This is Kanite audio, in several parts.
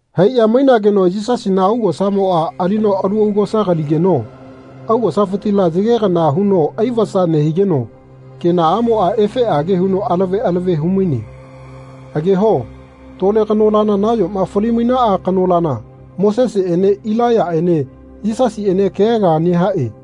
Haiꞌya mainageno Yisasina augosamoꞌa alino alu augosa kaligeno augosafitila yage kana huno ai-vasa nehigeno kenaꞌamoꞌa efeꞌage huno alave alave hu-maine. Ageho tole kanolana nayoma fali-mainaꞌa kanolana Moseseꞌene Ilaiyaꞌene Yisasiꞌene kea kea nehaꞌe.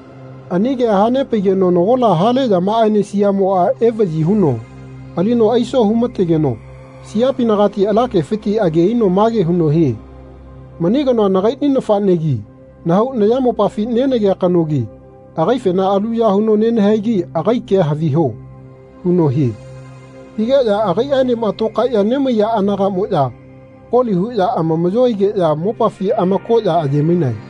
Ani kea hanepaigeno nagola hale yamaꞌaene siaꞌmoꞌa evaꞌyi huno alino aiso hu-mategeno siapinagati ala kefiti age aino mage huno hie “Mani kanoa nagai nafaꞌnegi nahau nayamopafi nenagea kanogi agaifena aluya huno nenahaigi agai kea haviho.” huno hie. Higeꞌya agaiꞌaenema tokaeꞌya nemaiya anagaꞌmoꞌya koli huꞌya amamaꞌyo aigeꞌya mopafi amakoꞌya aiye-mainae.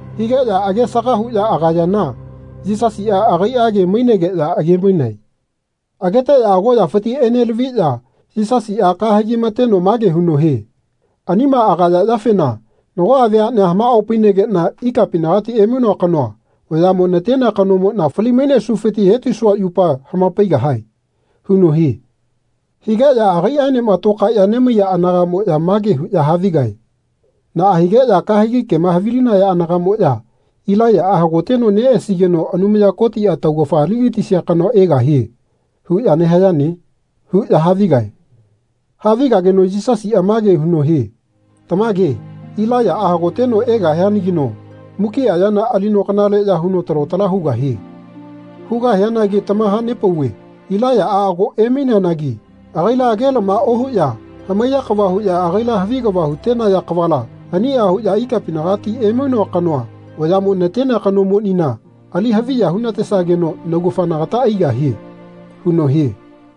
Higeꞌya age-saga huꞌya agayana Yisasiꞌa agaiꞌage mainegeꞌya age-mainae. Ageteꞌya agoꞌyafiti enelaviꞌya Yisasiꞌa kahegi mateno mage huno hie “Anima agaya yafena nagoꞌa veaꞌnea hamaꞌopainegeꞌna ikapinagati emainoa kanoa vayaꞌmo natenea kanomoꞌna fali-mainesufiti hetisua yupa hama-paigahae.” huno hie. Higeꞌya agaiꞌaenema lokaeꞌya nemaiya anagaꞌmoꞌya mage huꞌya havigae “Naꞌa higeꞌya kahegi kema havilinaya anagaꞌmoꞌya ‘Ilaiyaꞌa hagoteno neꞌesigeno Anumaya Kotiꞌa taugafa ali-gatisia kanoa egahie.’ huꞌya nehayane?” huꞌya havigae. Havigageno Yisasiꞌa mage huno hie “Tamage Ilaiyaꞌa hagoteno egahianagino mukiꞌa yana alino kanaleꞌya huno talo tala hugahie. Hugahianagi tamaha-nepauve Ilaiyaꞌa ago emaineanagi agaila age-lama ohuꞌya hamaiya kava huꞌya agaila havi kava hu-tenaya kavala aniꞌa huꞌya ikapinagati emainoa kanoa vayaꞌmo natenea kanomonina ali haviya hu-natesageno naugafa nagata aigahie.” huno hie.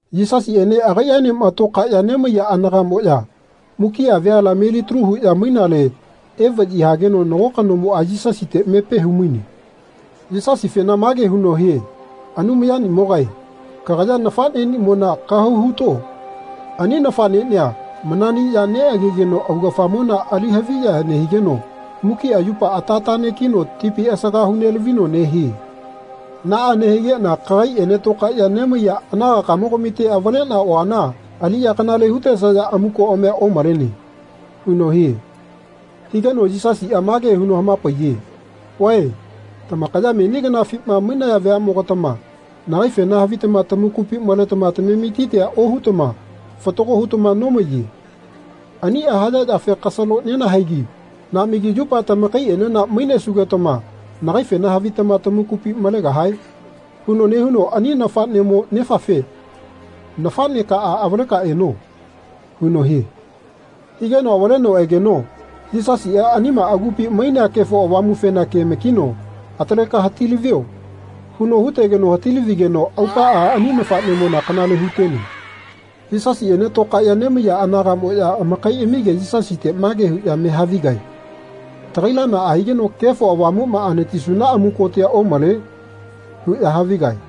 Yisasiꞌene agaiꞌaenema tokaeꞌya nemaiya anagaꞌmoꞌya mukiꞌa veala melitalu huꞌya mainale evaꞌyi hageno nago kanomoꞌa Yisasite mepe hu-maine. Yisasifena mage huno hie “Anumayamogae kagaya neꞌnafaꞌneꞌnimona kahau huto. Ani nafaꞌneꞌnia mananiꞌya neꞌagegeno augafamona ali haviya nehigeno mukiꞌa yupa ata taꞌnekino tipi asaga hu-nelavino nehie. Naꞌa nehigeꞌna kagaiꞌene tokaeꞌya nemaiya anagakamogamite avaleꞌna oana aliꞌya kanale hu-tesaya amukoꞌamia omalene.” huno hie. Higeno Yisasiꞌa mage huno hama-paiye “Vae tamakaya meni kanafima mainaya veaꞌmogatama nagaifena havitama tamakupi maletama tametitia ohutama fatago hutama nomaiye. Aniꞌa haya yafe kasalo nenahaegi naꞌmagi yupa tamakaiꞌenena mainesugetama nagaifena havitama tamakupina malegahae? huno nehuno ani nafaꞌnemo nefafe ‘Nafaꞌnekaꞌa avaleka eno.’ huno hie. Higeno avaleno egeno Yisasiꞌa anima agupi mainea Kefo Avamufena ke-makino ‘Ataleka hati-lavio.’ huno hutegeno hati-lavigeno aupaꞌa ani nafaꞌnemona kanale hu-tene.” Yisasiꞌene tokaeꞌya nemaiya anagaꞌmoꞌya amakaiꞌamige Yisasite mage huꞌya me havigae “Tagaila naꞌa higeno Kefo Avamuꞌma anatisuna amukotia omale?” huꞌya havigae.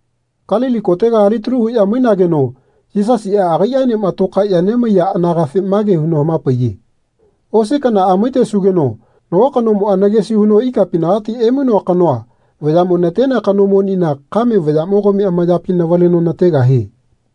Kalili kotega alitalu huꞌya mainageno Yisasiꞌa agaiꞌaenema tokaeꞌya nemaiya anagafe mage huno hama-paiye “Osi kanaꞌa maitesugeno nago kanomoꞌa nagesi huno ikapinagati emainoa kanoa vayaꞌmo natenea kanomonina kame vayaꞌmogami amayapi navaleno nategahie.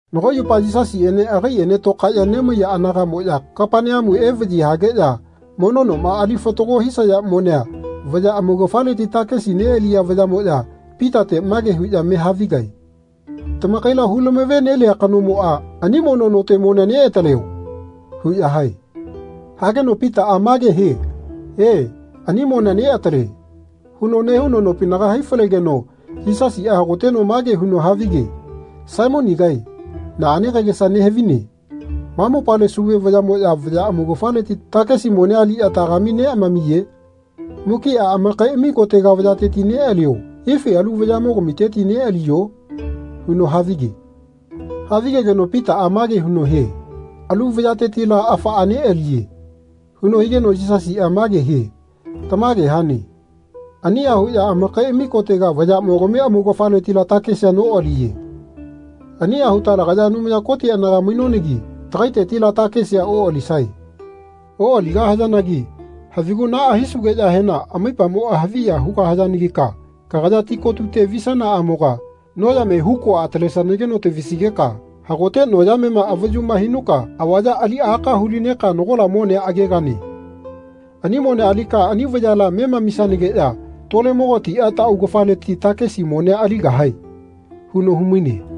Nago yupa Yisasiꞌene agaiꞌene tokaeꞌya nemaiya anagaꞌmoꞌya Kapaneamu evaꞌyi hageꞌya mono noma ali fatago hisaya monea vaya amaugafaleti takesi neꞌaliya vayaꞌmoꞌya Pitate mage huꞌya me havigae “Tamakaila hu-lamave-nelia kanomoꞌa ani mono note monea neꞌataleo.” huꞌya hae. Hageno Pitaꞌa mage hie “E, ani monea neꞌatale.” huno nehuno nopinaga hai-falegeno Yisasiꞌa hagoteno mage huno havige “Saimonigae naꞌane kagesa nehavine. Ma mopale sauve vayaꞌmoꞌya vaya amaugafaleti takesi monea aliꞌya tagami neꞌamamiye? Mukiꞌa amakaiꞌami kotega vayateti neꞌalio ifi alu vayaꞌmogamiteti neꞌaliyo?” huno havige. Havigegeno Pitaꞌa mage huno hie “Alu vayatetila afaꞌa neꞌaliye.” huno higeno Yisasiꞌa mage hie “Tamage hane. Aniꞌa huꞌya amakaiꞌami kotega vayaꞌmogami amaugafaletila takesi noꞌaliye. Aniꞌa huta lagaya Anumaya Koti anaga mainonagi tagaitetila takesia oꞌalisae. Oꞌaligahayanagi havigu naꞌa hisunageꞌyahena amaipamoꞌa haviya hugahayanagika kagaya ti kotute visanaꞌamoga noyame hukua atalesanageno tavisigeka hagote noyamema avayuma hinuka avaya ali aka hu-lineka nagola monea agegane. Ani monea alika ani vayala memamisanageꞌya tolemogatiꞌa taꞌaugafaleti takesi monea aligahae.” huno hu-maine.